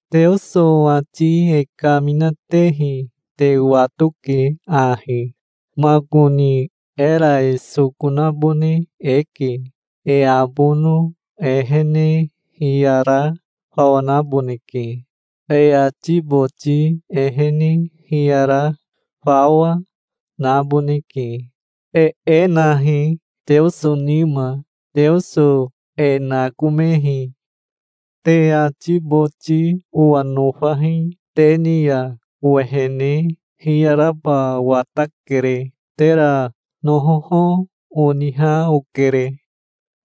Teoso ati e kaminatehi te watoke ahi. Makoni era e soko nabone eke. E abono ehene hiyara fawa naboneke. E ati boti ehene hiyara fawa, naboneke. E e nahi Teoso nima. Teoso e nakomehi. Te ati boti owa nofahi. Te ni ya owehene hiyaraba watakere. Tera nohoho oniha okere.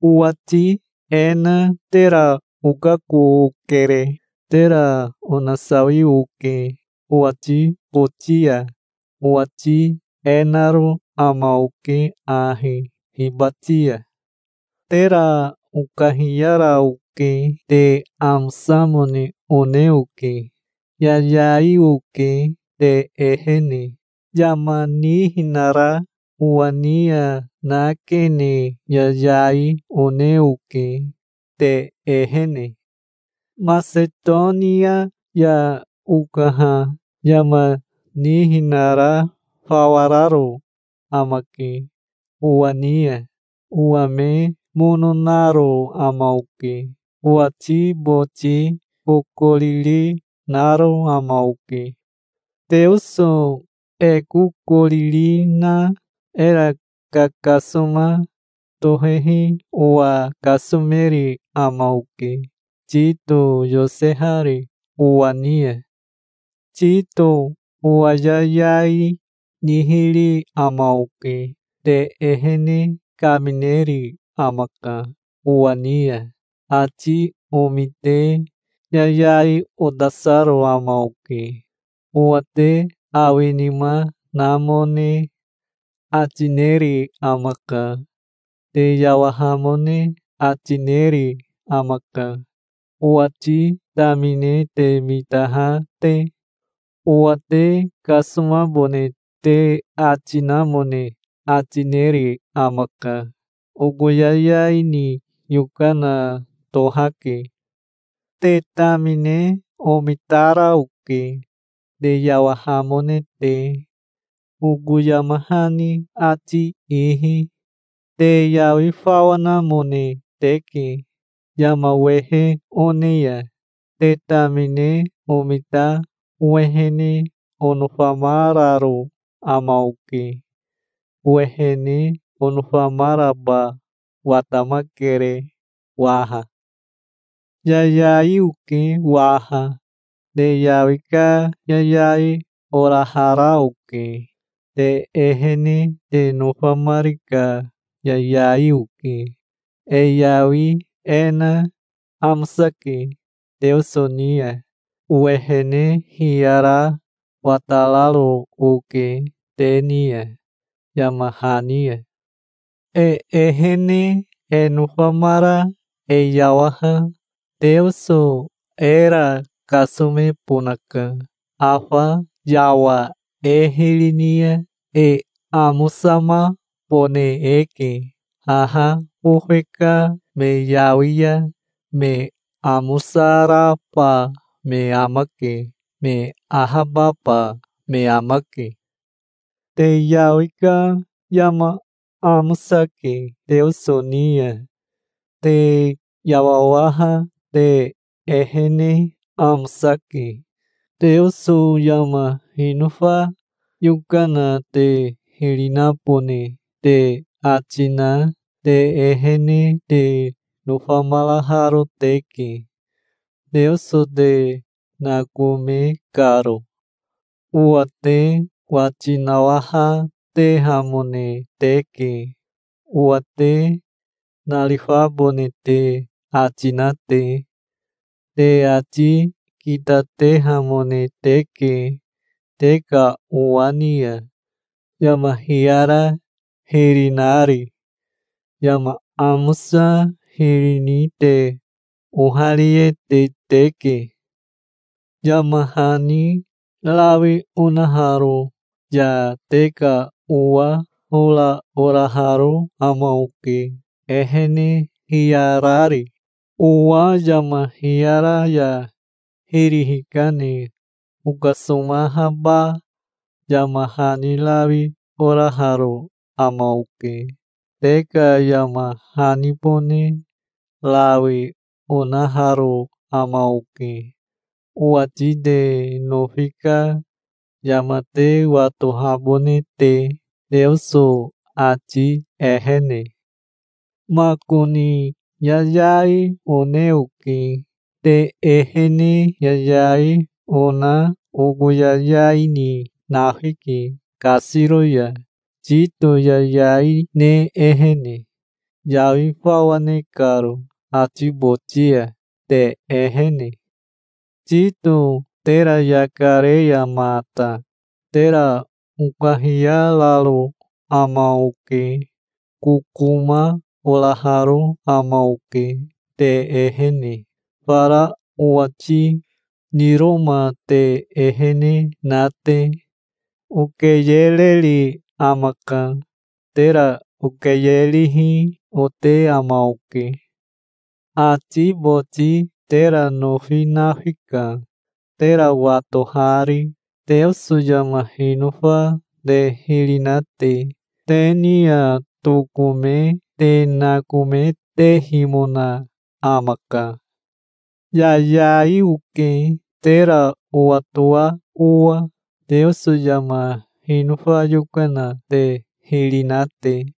Owati e na tera okako okere. Tera onasawi oke owati boti ya. Owati e naro ama oke ahi hibati ya. Tera okahiyara oke. Te amosamone one oke. Yayai oke te ehene. Yama nihinara owa ni ya nakene yayai one oke te ehene. Masetonia ya okaha yama nihinara fawa raro amake owa ni ya. Owa me mono naro ama oke. Owati boti kokoriri naro ama oke. Teoso e kokoriri na era kakasoma tohehi owa kasomeri ama oke, Tito yosehari owa ni ya. Tito owa yayai nihiri ama oke. Te ehene kamineri amaka owa ni ya. Ati omite yayai otasaro ama oke. Owa te awinima namone ati neri amaka. Te yawahamone ati neri amaka, owati tamine te mitaha te. Owa te kasomabone te ati namone ati neri amaka. Oko yayai ni yokana tohake. Te tamine omitara oke, te yawahamone te, oko yama hani ati ihi. Te yawi fawa namone teke yama wehe one ya. Te tamine omita owehene onofamararo ama oke. Owehene onofamaraba watamakere waha. Yayai oke waha. Te yawi ka yayai orahara oke. Te ehene te nofamari ka yayai oke. E yawi e na amosake Teoso ni ya. Owehene hiyara watararo oke te ni ya, yama hani ya. E ehene e nofamara e yawaha Teoso era kasomebonaka. Afa yawa e hiri ni ya e amosamabone eke. Haha bofe ka me yawi ya me amosaraba me amake. Me ahababa me amake. Te yawi ka yama amosake Teoso ni ya. Te yawawaha te ehene amosake. Teoso yama hinofa yokana te hiri nabone te ati na te ehene te nofamaraharo teke, Teoso te nakome karo. Owa te wati nawahatehamone teke, owa te narifabone te ati na te. Te ati kitatehamone teke te ka owa ni ya, yama hiyara hiri nari. Yama amosa hiri ni te ohariete teke. Yama hani rawi onaharo ya te ka owa hora oraharo ama oke, ehene hiyarari. Owa yama hiyara ya hiri hikane okasomahaba yama hani rawi oraharo ama oke. Te ka yama hanibone rawi onaharo ama oke, owati te nofi ka yama te watohabone te, Teoso ati ehene. Makoni yayai one oke. Te ehene yayai ona oko yayai ni nafike kasiro ya, Tito yayai ne ehene, yawi fawa ne karo ati boti ya, te ehene. Tito tera yaka re ya mata tera okahiyararo ama oke. Kokoma oraharo ama oke te ehene, fara owati niroma te ehene na te. Okeyereri amaka. Tera okeyerihi ote ama oke. Ati boti tera nofi nafika, tera watohari, Teoso yama hinofa te hiri na te. Te ni ya tokome te nakometehimona amaka. Yayai oke, tera owatoa owa, Teoso yama hinofa yokana te hiri na te.